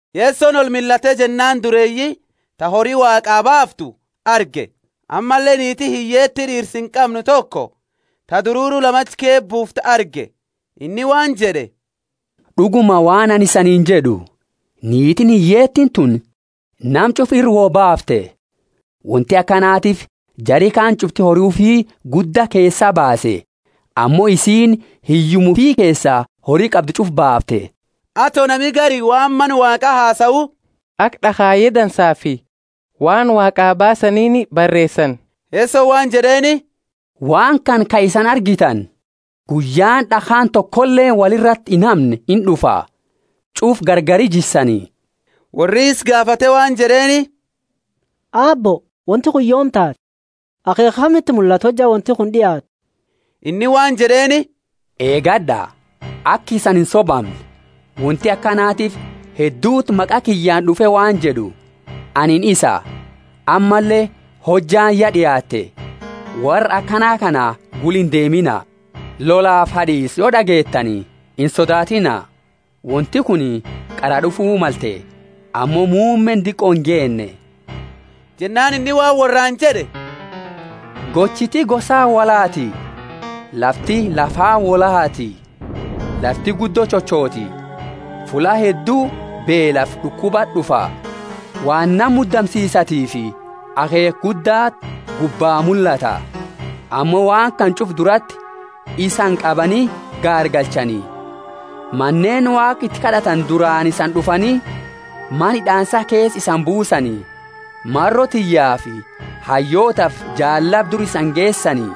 Yesoni olmillate jennaani dureeyi ta hori Waaqa baaftu arge, ammalle niiti hiyyeeti d'iirsa inqamne toko ta dururu lama achi keesa buuftu arge. Inni waan jed'e, D'uguma waan anini isaaniini jed'u, Niitiini hiyyeetiini tuni nama ch'ufa ira wo baafte. Wonti akanatiifi jari kaani ch'ufti hori ufi gudda keesaa baase; ammo isiini hiyyuma ufi keesa hori qabdu ch'ufa baafte. Ato nami gari waan Mana Waaqa hasau, aka d'akhaye dansaafi waan Waaqaa baasaniini bareesani, Yesoni waan jed'eeni, Waan kana ka isani argitani, guyyaani d'akhaani tokoleeni woli irati inhamne ind'ufa; ch'ufa gargari jissani. Worri isa gaafate waan jed'eeni, Aabbo, wonti kuni yoomi taati? Akheekha kamiti mullata hojja wonti kuni d'iaattu? Inni waan jed'eeni, Eegad'a, aka isani insobamne. Wonti akanatiifi hedduti maqa kiyyaani d'ufe waan jed'u, Anini isa, ammalle, Hojjaani, ya d'iaatte. Worra akana kana gula indeemina. Lolafi had'iisa, yo d'ageetani, insodaatiina; wonti kuni qara d'ufu malte, ammo muummeeni diqo ingeenne. Jennaani inni waan worraani jed'e, Gochiti gosaani wolhaati, lafti lafaani wolhaati; lafti guddo chochoti, fulla heddu beelafi d'ukubati d'ufa; waan nama mudamsisatifi akheekha guddati gubba mullata. Ammo waan kana ch'ufa durati isani qabani gaargalchani, maneeni Waaqa iti kad'atani duraani isani d'ufani, mana hid'aansa keesa isani buusani; maro tiyyaafi hayyootafi jaallaba dura isani geesani.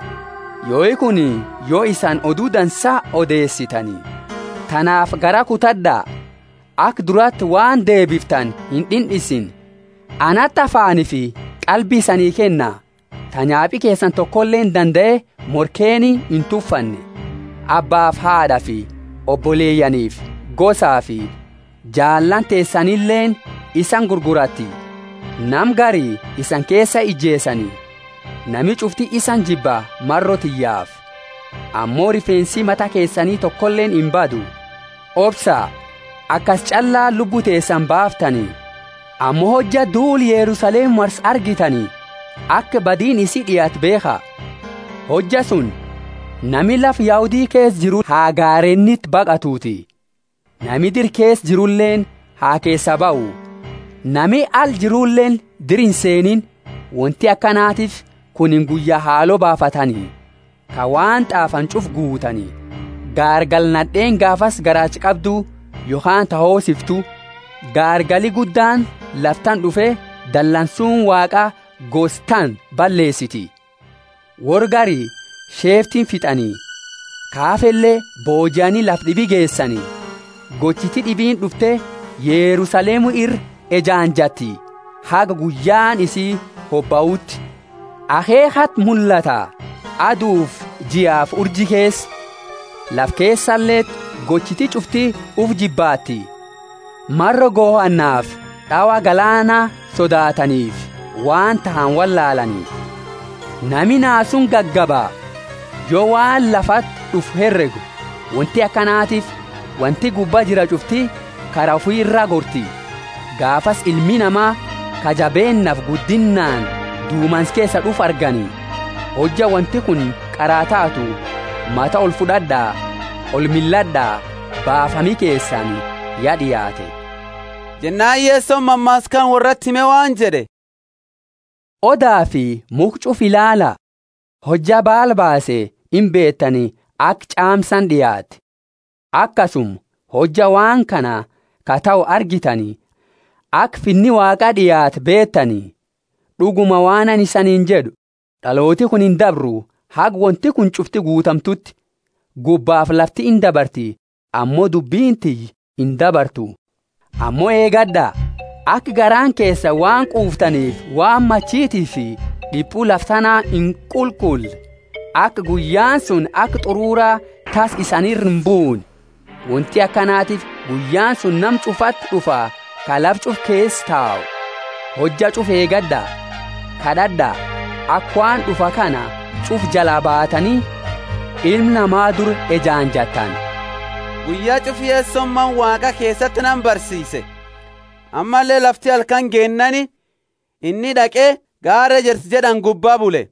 Yoi kuni yo isani Odu Dansa odeesitani. Tanaafi garaa kutad'a, aka durati waan deebiftani ind'ind'insine; anati afaanifi qalbi isanii kenna, ta nyaapi keesani tokoleeni dandae morkeeni intufanne. Abbaafi haad'afi oboleyaanifi gosafi jaalaani teesanileeni isani gurguratti; nama gari isani keesa inijeesani. Nami ch'ufti isani jibba, maro tiyyaafi. Ammo rifeensi mata keesani tokoleeni imbadu. Obsa akasi ch'allaani lubbu teesani baaftani. Ammo hojja duula Yerusalemu marsu argitani, aka badiini isii d'iaate beekha. Hojja suni nami lafa Yahudi keesa jiru ha gareeniti baqatuti; nami dira keesa jiruleeni ha keesaa bahu; nami ala jiruleeni dira inseeniini. Wonti akanatiifi kunini guyya haalo baafatani, ka waan t'aafani ch'ufa guutani. Gaargala nad'eeni gaafasi garaacha qabdu, yokhaani ta hoosiftu. Gaargali guddaani lafa tana d'ufe dalansuuni Waaqa gosa tana balleesiti. Worra gari sheeftini fit'ani, ka hafele boojiani lafa d'ibi geesani. Gochiti d'ibiini d'ufte Yerusalemu ira ejaanjatti haga guyyaani isii hobauti. Akheekhati mullata adufi jiafi urji keesa. Lafa keesaleti gochiti ch'ufti ufi jibbaatti, maro gohannaafi d'awa galaana sodaataniifi waan tahani wollaalaani. Nami naasuuni gagaba, yo waan lafati d'ufu heregu; wonti akanatiifi wonti gubba jira ch'ufti kara ufi iraa gorti. Gaafasi Ilmi Nama, ka jabeennaafi guddinnaani dumansa keesa d'ufu argani. Hojja wonti kuni qara taatu, mata olfud'ad'a, olmillad'a, baafami keesani ya d'iaate. Jennaani Yesoni mammaasa kana worrati hime waan jed'e, Odafi mukha ch'ufa ilaala. Hojja baala baase, imbeetani aka ch'aamsaani d'iaate. Akasuma, hojja waan kana ka tahu argitani, aka Finni Waaqa d'iaate beetani. D'uguma waan anini isaniini jed'u, D'aloota kuni indabru, haga wonti kuni ch'ufti guutamtuuti. Gubbafi lafti indabarti, ammo dubbini tiyya indabartu. Ammo eegad'a, aka garaani keesani waan quuftaniifi waan, machitiifi d'ipu lafa tana inqulqulle, aka guyyaani suni aka t'urura tassa isani ira imbuune. Wonti akanatiifi guyyaani suni nama ch'ufati d'ufa ka lafa ch'ufa keesa tau. Hojja ch'ufa eegad'a, kad'ad'a, aka waan d'ufa kana ch'ufa jalaa baatani, Ilma Nama dura ejaanjattani. Guyya ch'ufa Yesoni Mana Waaqa keesati nama barsiise, ammalle lafti halkani geennaani inni d'aqe Gaara Ejersa jed'ani gubbaa bule.